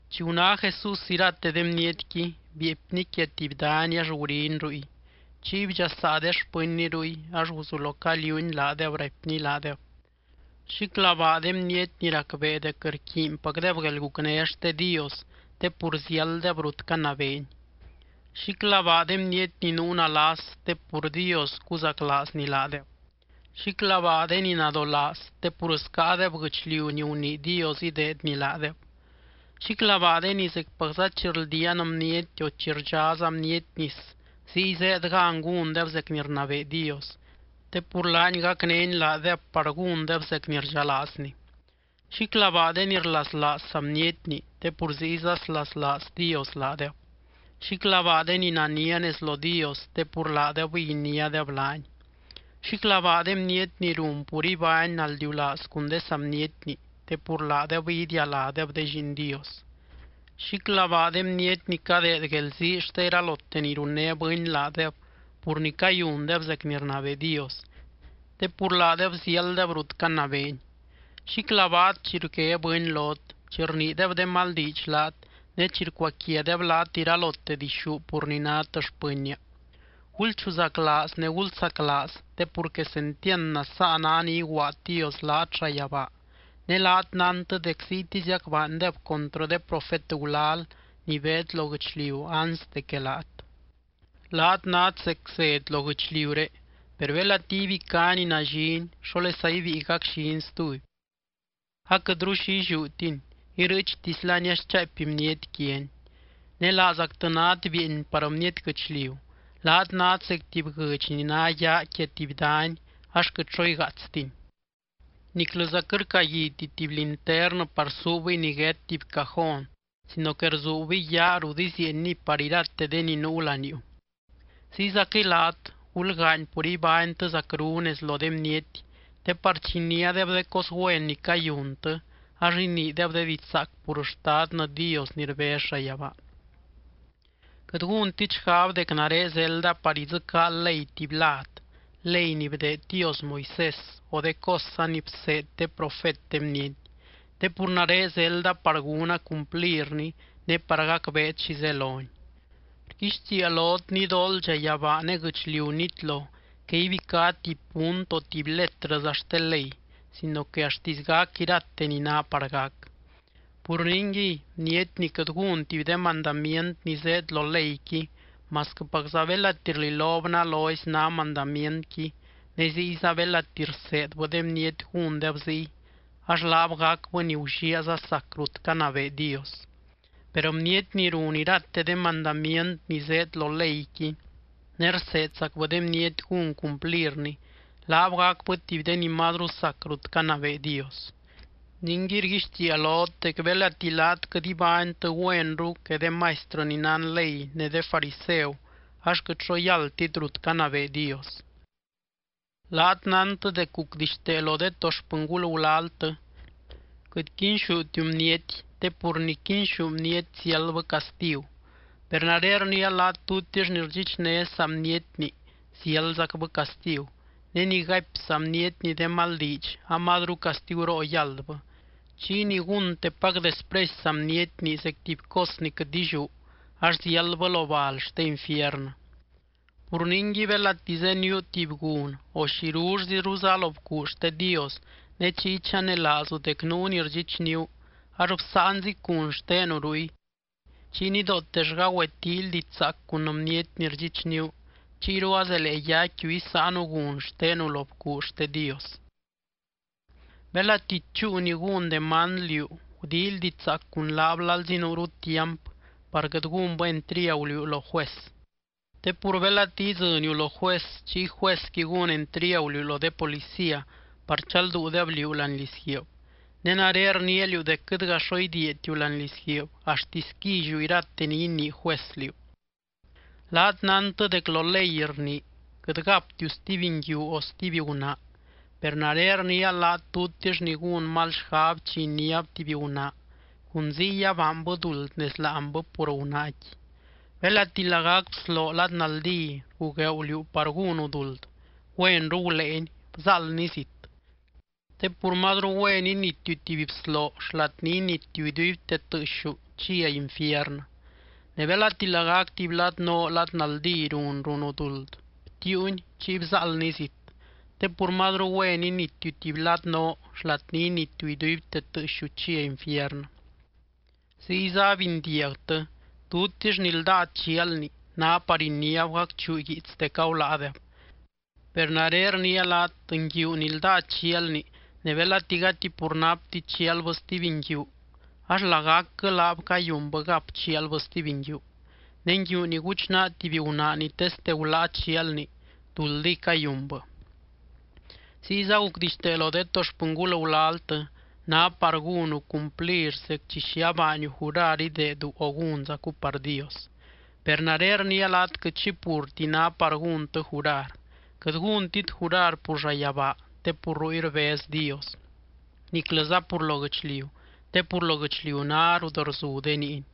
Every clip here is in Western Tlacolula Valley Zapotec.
Chi guná Jesús irate de bnietqui, bieepny quia tuby dany ax guriny ruy. Chiy bdxasaa de xpɨnny ruy ax guzulo caliuuny laadeb raipny laadeb: —Xíclabaa de bniety ni racbee dec rquiinpacdeb guelgucné xte Dios, te pur ziálddeb rut canabeeny. ’Xíclabaa de bniety ni nuu nalas, te pur Dios cuzaclaazny laadeb. ’Xíclabaa de ni nadolaaz, te pur scáadeb guɨchliu ni gunii Dios ideedny laadeb. ’Xíclabaa de ni zecpacza chi rldiaan bniety o chi rdxáza bniety nis ziy zéed gan gúndeb zec ni rnabee Dios, te pur laany gacnény laadeb par gúndeb zec ni rdxalaazny. ’Xíclabaa de ni rlaslaaz saa bnietni, te pur ziyza slaslaaz Dios laadeb. ’Xíclabaa de ni nania nez lo Dios, te pur laadebɨy iniádeb laany. ’Xíclabaa de bniety ni run pur ibány naldiulaaz cun de saa bnietni, te pur laadebɨy idialádeb de lliin Dios. ’Xíclabaa de bniety ni cadeed guelzii xte iralote ni runné bɨny laadeb pur ni cayundeb zec ni rnabee Dios, te pur laadeb ziálddeb rut canabeeny. ’Xíclabaat, chi rgué bɨny lot, chi rniideb de mal diidx laat ne chi rcuaquiadeb laat iralote dixú pur ni nát xpɨnnia. Gulchuzaclaaz ne gulsaclaaz, te pur quesentiand nasaa ná ni iguaad Dios laat llayabaa ne laat nántɨ dec ziytiziac baandeb contrɨ de profet gulal ni beed lo guɨchliu anste que laat. ’Laat nát zec zed lo guɨchliuré. Per belati ibicá ni nallini, ¿xólesa ibíi gacllini stuby? Aquɨtru xi illiútini, irɨɨchtislani ax chaapy bniety quiani. ’Ne laazactɨ nát bieeny par bniety guɨchliu. Laat nát zec tuby guɨdx ni ná yaa quia tuby dany ax quɨt xo igaatstini. Niclɨza quɨt rcaguiti tuby linternɨ par suubɨy niguét tuby cajón sino que rzuubɨy yaa rut izieenniy par irate de ni nuu laniuu. Ziyzaquɨy laat, gulgaany pur ibánytɨ zacru nez lo de bniety te par chi iniádeb de cos güen ni cayuntɨ, ax iniideb de diidx zaac pur Xtadtɨ Dios ni rbez llayabaa. ’Quɨt gúntit xgab dec nare zelda par idzɨcaa ley tuby lad, ley ni bdeed Dios Moisés o de cosza ni bseed de profet de bniety, te pur nare zelda par gúna cumplirni ne par gacbeet xi zeloni. Rguixtiia lot nidooldxa yabaa ne guɨchliu nitlo que ibicá tuby punt o tuby letrɨza xte ley sino que axtisy gac irate ni ná par gac. Pur ningui, bniety ni quɨt gún tuby de mandamient ni zéed lo leyqui masquɨpacza belati rlilob nalozy ná mandamientqui ne ziyza belati rseedbɨ de bniety gúndeb ziy, ax laab gacbɨ ni gulliaaza sac rut canabee Dios. Per bniety ni run irate de mandamient ni zéed lo leyqui ne rseedzacbɨ de bniety gún cumplirni, laab gacbɨ tuby de ni mazru sac rut canabee Dios. Ningui rguixtiia lot dec belati laat quɨt ibánytɨ güenru que de maistrɨ ni nán ley ne de fariseu ax quɨt xo yáldtit rut canabee Dios. ’Laat nántɨ dec gucdixtee lo de to xpɨngul gulaltɨ: “Quɨt quinxútiu bniety, te pur ni quinxú bniety ziáldbɨ castigu.” Per nare rniia laat tutix ni rdxichné saa bnietni ziáldzacbɨ castigu, ne ni gaipy saa bnietni de mal diidx amazru castiguroo yáldbɨ, chiy ni gúntepac despresy saa bnietni zec tuby cos ni quɨt illiú ax ziáldbɨ lo bal xte infiernɨ. ’Pur ningui, belati zéniuu tuby gun o xirullziruza lo bcuu xte Dios ne chiy chanelaazu dec nuu ni rdxichníu, ax bsáanzic gun xtenu ruy. Chiy nidootellga güetíily diidx zaac cun bniety ni rdxichníu, chiyru azelee yaicquiu isáanu gun xtenu lo bcuu xte Dios. ’Belati chúu ni gún demand liú gudíily diidx zaac cun laab lalzi nuuru tiamp, par quɨt gúnbɨ entriagu liú lo juez. Te pur belati idzɨniu lo juez, chiy juezqui gún entriagu liú lo de policía par chalduudeb liú láani lizguiib. Ne nare rniia liú dec quɨtga xo idiiatiu láani lizguiib axtisy quilliu irate ni inii juez liú. ’Laat nántɨ dec lo ley rnii: “Quɨt gaptiu stuby nguiu o stuby gunaa.” Per nare rniia laat tutix ni gún mal xgab chi iniáb tuby gunaa, cun ziy abaanbɨ duld nez láanbɨ pur gunaaqui. ’Belati lagac bsloo lad naldí rgugueu liú par gúnu duld, güenru guléeni bzáaldni zit. Te pur mazru güen initiu tuby bsloo xlat ni initiu iduibte tɨɨxiu chia infiernɨ. Ne belati lagac tuby lad noo lad naldí run runu duld, btiiuni chiy bzáaldni zit. Te pur mazru güen initiu tuby lad noo xlat ni initiu iduibte tɨɨxiu chia infiernɨ. ’Ziyza abindiagtɨ: “Tutix ni ldáa chialni, ná par iniáb gacchuu guiits dec aguláadeb.” Per nare rniia laat nguiu ni ldáa chialni ne belati gati pur napti chialbɨ stuby nguiu, ax lagacquɨ laab cayunbɨ gap chialbɨ stuby nguiu. Ne nguiu ni guchnaa tuby gunaa ni teste guláa chialni, duldiy cayunbɨ. ’Ziyza gucdixtee lo de to xpɨngul gulaltɨ: “Ná par gúnu cumplir zec chi xi abaaniu jurar ideedu o gúnzacu par Dios.” Per nare rniia laat quɨt xi purti ná par gúntɨ jurar. Quɨt gúntit jurar pur llayabaa te pur ruy rbez Dios, niclɨza pur lo guɨchliu, te pur lo guɨchliu ná rut rzu de niiny.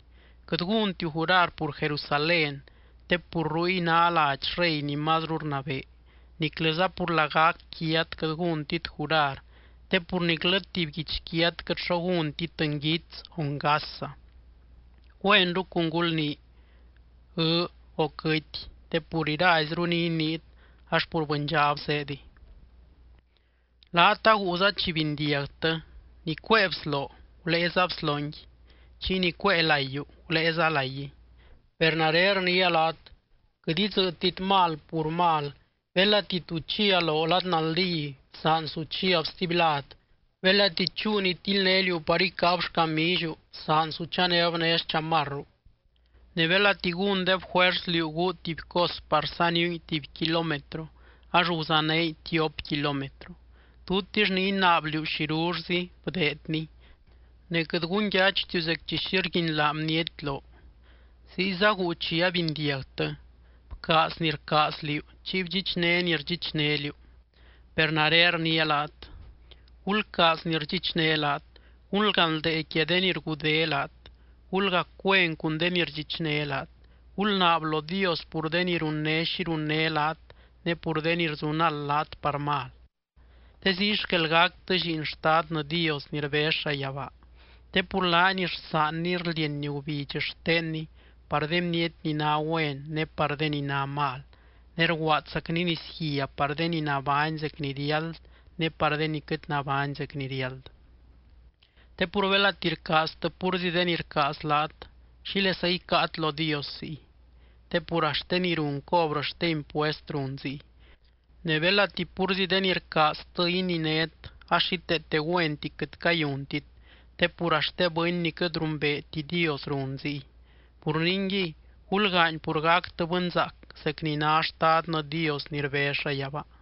Quɨt gúntit jurar pur Jerusalén te pur ruy ná ladx Rey ni mazru rnabee. Niclɨza pur lagac quiat quɨt gúntit jurar, te pur niclɨ tuby guichquiat quɨt xo gúntit nguits o ngasza. Güenru cun gulnii “Ɨɨ́” o “Quɨty”, te pur iraizru ni iniit ax pur bɨndxab azéediy. ’Laat aguuza chi bindiagtɨ: “Ni cuée bsloo, guléeza bslongui. Chiy ni cuée laiyu, guléeza laiguiy.” Per nare rniia laat: Quɨt idzɨ́ɨtit mal pur mal, belati tu chia loo lad naldí, bsaan su chiab stuby lad. Belati chúu ni tildné liú par icáab xcamilliu, bsaan su chanéb né xchamarru. Ne belati gúndeb juers liú guu tuby cos par saniungui tuby kilómetro, ax guzanéngui tiop kilómetro. Tutix ni inaab liú xirullzi, bdeedni. Ne quɨt gunyachtiu zec chi xi rguinlaa bniety loo. ’Ziyza guu chi abindiagtɨ: “Bcaaz ni rcaaz liú, chiy bdxichné ni rdxichné liú.” Per nare rniia laat: Gulcaaz ni rdxichné laat, gulganldee quia de ni rgudé laat. Gulgac güen cun de ni rdxichné laat, gulnaab lo Dios pur de ni runné xi runné laat ne pur de ni rzunald laat par mal. Te ziy xquel gactɨ lliin Xtadnɨ Dios ni rbez llayabaa, te pur laany rsaanny rldieny gubidx xtenny par de bniety ni ná güen ne par de ni ná mal, ne rguaadzacny nisguia par de ni nabány zec ni riáld ne par de ni quɨt nabány zec ni riáld. Te pur belati rcaaztɨ púrzi de ni rcaaz laat, ¿xílesa icáat lo Dios ziy? Te pur axt de ni run cobrɨ xte impuest run ziy. Ne belati púrzi de ni rcaaztɨ ininét, ax xíteete güenti quɨt cayuntit, te pur axt de bɨny ni quɨt rumbeeti Dios run ziy. Pur ningui, gulgaany pur gactɨ bɨnzaac, zec ni ná Xtadnɨ Dios ni rbez llayabaa.